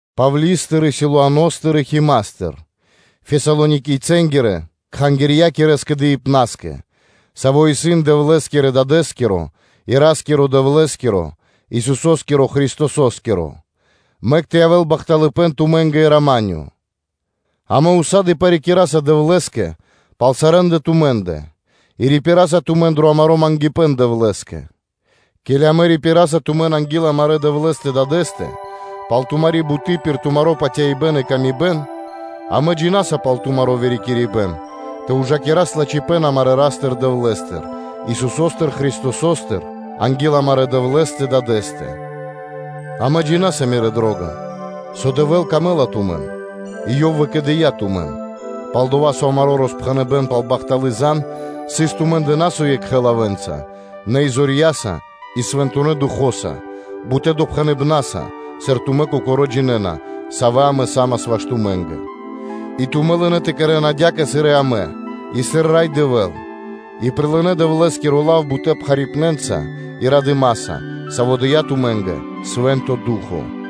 Павли́стыр и Силуаностыр и Химастыр, Фесалоникийцэнгирэ-кхангирья́кирэ скэдыибнаскэ, саво́ исын Дэвлэ́скирэ Дадэ́скиро и Ра́скирэ-Дэвлэ́скиро, Исусо́скиро Христосо́скиро: мэк тэ явэ́л бахталыпэ́н тумэ́нгэ и рама́нё (миро). Амэ ўса́ды (сак) парикираса Дэвлэ́скэ пал сарэ́ндэ тумэ́ндэ, и рипираса тумэн дро амаро́ мангипэ́н Дэвлэ́скэ, ке́ли амэ рипираса тумэн анги́л амарэ́ Дэвлэ́стэ Дадэ́стэ пал тумари́ буты́ пир тумаро́ патяибэ́н и паты́в кэ яви́р мануша́, амэ джина́са пал тумаро́ вырикирибэн тэ ужакирас лачхипэ́н амарэ́ Ра́стыр-Дэвлэ́стыр, Исусо́стыр Христосостыр анги́л амарэ́ Дэвлэ́стэ-Дадэ́стэ, амэ джина́са, мирэ́ дро́га, со Дэвлэ́скэ ячнэ́ дро́га тумэ́, и Ёв выкэдыя́ тумэн, пал-дова́ со амаро́ роспхэныбэн пал бахталы́ зан (звесь) сыс тумэ́ндэ на со екхэ лавэ́нца, нэ и зорья́са и Свэнтонэ́ Духо́са бутэ́ допхэныбнаса, сыр тумэ́ кокорэ́ джинэ́на, савэ́ амэ са́мас ваш тумэ́нгэ. И тумэ́ лынэ́ тэ кэрэ́н адя́кэ, сыр и амэ, и сыр Рай Дэвэ́л, и прилынэ́ Дэвлэ́скиро лав бутэ́ пхарипнэнца и радыма́са, саво́ дыя́ тумэ́нгэ Свэ́нто Ду́хо (Фа́но),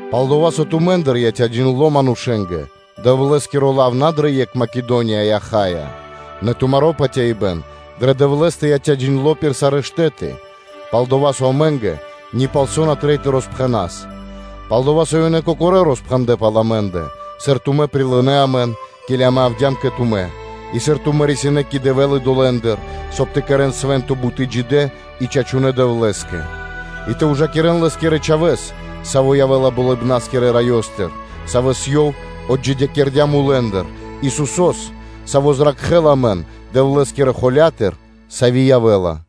Пал-дова́ со тумэ́ндыр яця́ джиндло́ манушэ́нгэ Дэвлэ́скиро лав на дрэ екх Македония и Ахаия, нэ тумаро́ патяибэ́н дрэ Дэвлэ́стэ яця́ джиндло́ пир сарэ́ штэ́ты, пал-дова́ со амэ́нгэ ни палсо́ на трэй тэ роспхэнэ́н; пал-дова́ со ёнэ кокорэ́ роспхэндлэ́ пал амэ́ндэ, сыр тумэ́ прилынэ́ амэн, ке́ли амэ явдя́м кэ тумэ́: и сыр тумэ́ рисинэ́ кэ Дэвэ́л идолэндыр, соб (кай) тэ кэрэ́н свэ́нто буты́ джидэ́ и чачунэ́ Дэвлэ́скэ, и тэ ужакирэн Лэ́скирэ Чхавэ́с, саво́ явэ́ла Болыбна́скирэ Раёстыр, Савэс Ёв отджидякирдя́ мулэ́ндыр, Исусо́с, Саво́ зракхэ́ла амэн Дэвлэ́скирэ холя́тыр, сави́ явэ́ла.